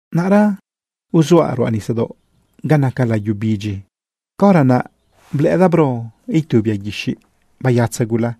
Naꞌra uzuaꞌ ruꞌa nisadaoꞌ ga naca layu bidyi, caora naꞌ blëꞌëdaꞌ bro itu bia guixiꞌ bayatza gula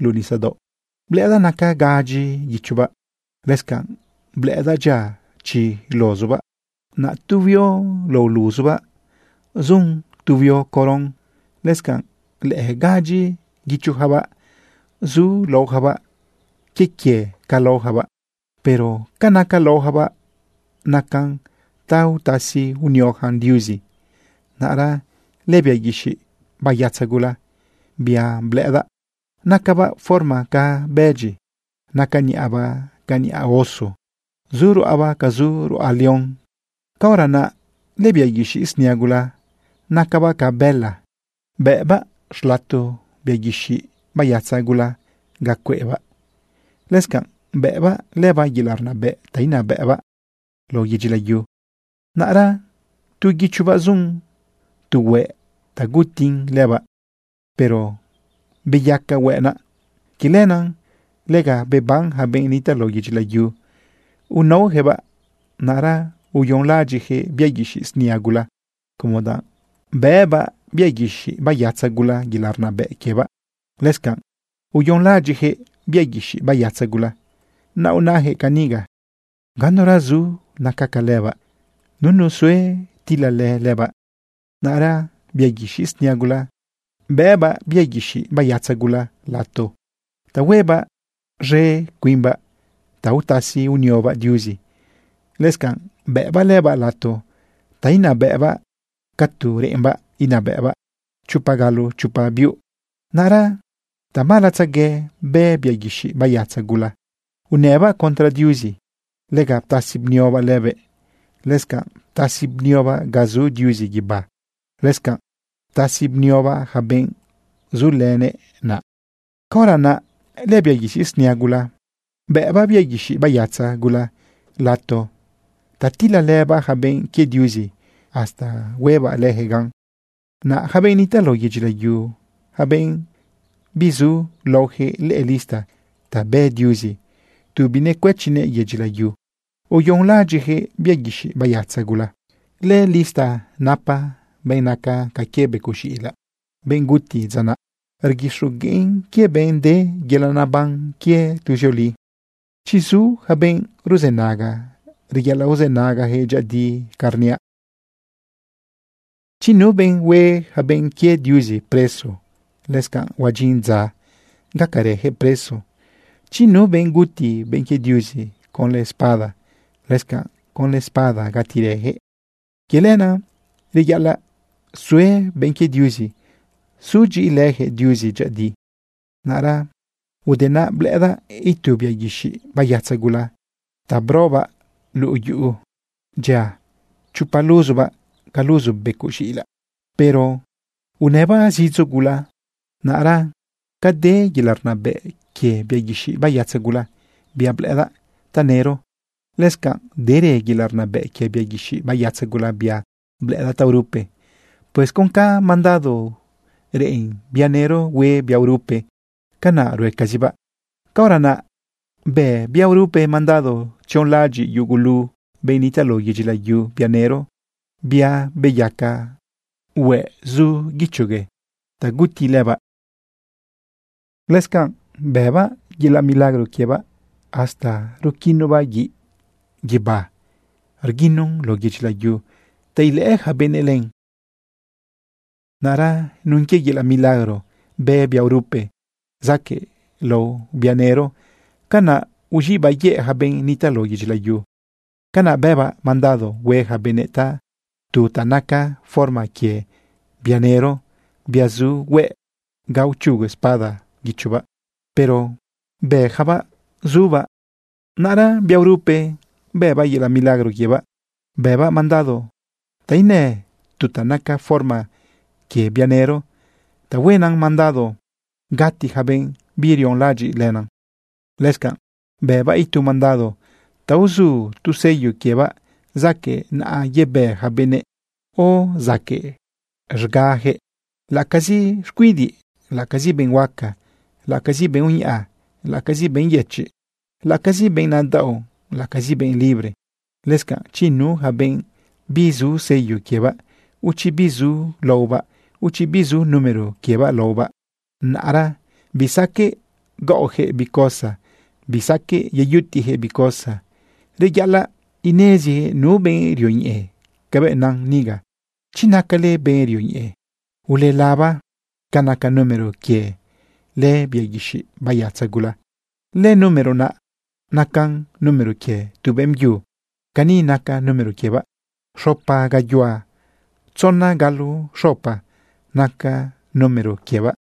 luꞌu nisadaoꞌ. Blëꞌëdaꞌ naca gadyi guichobaꞌ. Lëscanꞌ blëꞌëdaꞌ dyia chi luzubaꞌ. Naꞌ tu huio lao luzubaꞌ zun tu huio coron. Lëscanꞌ lëꞌë gadyi guichojabaꞌ zu laojabaꞌ quie quie ca laojabaꞌ. Pero ca naca laojabaꞌ nacan ta utasi unioyacan Diuzi. Naꞌra lëbia guixiꞌ bayatza gula, bia blëꞌëdaꞌ, nacabaꞌ forma ca bëdyi. Naca niꞌabaꞌ ca niꞌa oso. Zu ruꞌabaꞌ ca zu ruꞌa león. Caora naꞌ lëbia guixiꞌ snia gula nacabaꞌ ca bëla, bëꞌbaꞌ xlato bia guixiꞌ bayatza gula ga cueꞌbaꞌ. Lëscanꞌ bëꞌbaꞌ lëbaꞌ yelaꞌ rnabëꞌ ta inabëꞌbaꞌ lao yedyi layu. Naꞌra tu guichobaꞌ zun tu hueꞌ ta gutin lëbaꞌ, pero beyaca hueꞌ naꞌ. Quie lenaꞌ lega beban ja benꞌ nitaꞌ lao yedyi layu unaojëꞌbaꞌ. Naꞌra uyonlaꞌadyiꞌjëꞌ bia guixiꞌ snia gula, como danꞌ bëꞌbaꞌ bia guixiꞌ bayatza gula yelaꞌ rnabëꞌ quiebaꞌ. Lëscanꞌ uyonlaꞌadyiꞌjëꞌ bia guixiꞌ bayatza gula. Naꞌ unajëꞌ caniga: ―Ganura zu naca ca lëbaꞌ. Nunu sue tilalë lëbaꞌ. Naꞌra bia guixiꞌ snia gula bëꞌbaꞌ bia guixiꞌ bayatza gula lato ta huebaꞌ z̃e cuimbaꞌ ta utasi uniobaꞌ Diuzi. Lëscanꞌ bëꞌbaꞌ lëbaꞌ lato ta inabëꞌbaꞌ ca tu reꞌembaꞌ inabëꞌbaꞌ chopa galo chopa biuꞌ. Naꞌra tamalatzague bë bia guixiꞌ bayatza gula unëbaꞌ contra Diuzi. Lega ptasi bniobaꞌ lëbëꞌ. Lëscanꞌ ptasi bniobaꞌ ga zu Diuzi guibá. Lëscanꞌ ptasi bniobaꞌ ja benꞌ zulënëꞌ naꞌ. Caora naꞌ lëbia guixiꞌ snia gula bëꞌbaꞌ bia guixiꞌ bayatza gula lato ta tilalëbaꞌ ja benꞌ quie Diuzi hasta huebaꞌ lëjëꞌ gan. Naꞌ yaca benꞌ nitaꞌ lao yedyi layu, yaca benꞌ bizu laojëꞌ lëꞌë lista ta bë Diuzi tu binecuëchinëꞌ yedyi layu, uyonlaꞌadyiꞌjëꞌ bia guixiꞌ bayatza gula. Lëlista napa benꞌ naca ca quie becoꞌ z̃iꞌilaꞌ, benꞌ guti dza naꞌ. Rguixogueꞌn quie benꞌ de yelaꞌ naban quie tuzioli. Chi zu ja benꞌ ruzënaga, reyaꞌalaꞌ uzënagajëꞌ dyëꞌëdi ca rniaꞌ. Chi nu benꞌ hue yaca benꞌ quie Diuzi preso, lëscanꞌ huadyin dza gacarëjëꞌ preso. Chi nu benꞌ guti benꞌ quie Diuzi conlë espada, lëscanꞌ conlë espada gatirëjëꞌ. Quie lenaꞌ, reyaꞌalaꞌ sue benꞌ quie Diuzi sudyiꞌilëjëꞌ Diuzi dyëꞌëdi. Naꞌra ude naꞌ, blëꞌëdaꞌ itu bia guixiꞌ bayatza gula ta brobaꞌ luꞌu yu. Dyia chopa luzubaꞌ ca luzu becoꞌ z̃iꞌilaꞌ, pero unëbaꞌ zidzo gula. Naꞌra ca de yelaꞌ rnabëꞌ quie bia guixiꞌ bayatza gula, bia blëꞌëdaꞌ tanëro, lëscanꞌ derë yelaꞌ rnabëꞌ quie bia guixiꞌ bayatza gula, bia blëꞌëdaꞌ taorupe. Pues con ca mandado reꞌen bia nëro hue bia urupe, canaꞌ ruecazibaꞌ. Caora naꞌ bë bia urupe mandado tzionlaꞌadyiꞌ yugulu benꞌ nitaꞌ lao yedyi layu bia nëro, bia beyaca hueꞌ zu guichogue ta guti lëbaꞌ. Lëscanꞌ bëbaꞌ yelaꞌ milagro quiebaꞌ hasta ruquinobaꞌ guiꞌ guibá rguinon lao yedyi layu ta ilëꞌë ja benëꞌ len. Naꞌra nun quie yelaꞌ milagro bë bia urupe zaquëꞌlao bia nëro, canaꞌ uz̃iꞌbaꞌ yëꞌ ja benꞌ nitaꞌ lao yedyi layu. Canaꞌ bëbaꞌ mandado hue ja benëꞌ tu ta naca forma quie bia nëro, bia zu hueꞌ ga uchugu espada guichobaꞌ, pero beyacabaꞌ zubaꞌ. Naꞌra bia urupe bëbaꞌ yelaꞌ milagro quiebaꞌ, bëbaꞌ mandado ta inë tu ta naca forma quie bia nëro ta huenan mandado gati ja benꞌ birionlaꞌadyiꞌ lënan. Lëscanꞌ bëbaꞌ itu mandado ta uzu tu sello quiebaꞌ zaquëꞌ naꞌa yebë ja benëꞌ, o zaquëꞌ z̃gajëꞌ, laꞌacazi xcuidiꞌ, laꞌacazi benꞌ huaca, laꞌacazi benꞌ uñaꞌa, laꞌacazi benꞌ yëchiꞌ, laꞌacazi benꞌ nadaꞌo, laꞌacazi benꞌ libre. Lëscanꞌ, chi nu ja benꞌ bizu sello quiebaꞌ, o chi bizu laobaꞌ, o chi bizu número quie laobaꞌ, naꞌra bisaqueꞌ gaꞌojëꞌ bi cosa, bisaqueꞌ yeyutiꞌjëꞌ bi cosa. Reyaꞌalaꞌ inezi nu benꞌ rioñeꞌe cabëꞌ nan niga. Chi nacale benꞌ rioñeꞌe, ulelaba ca naca número quie lëbia guixiꞌ bayatza gula. Lënúmero naꞌ nacan número quie tu beꞌmbyu. Cani naca número quiebaꞌ: Xopa gayuhua tzona galo xopa naca número quiebaꞌ.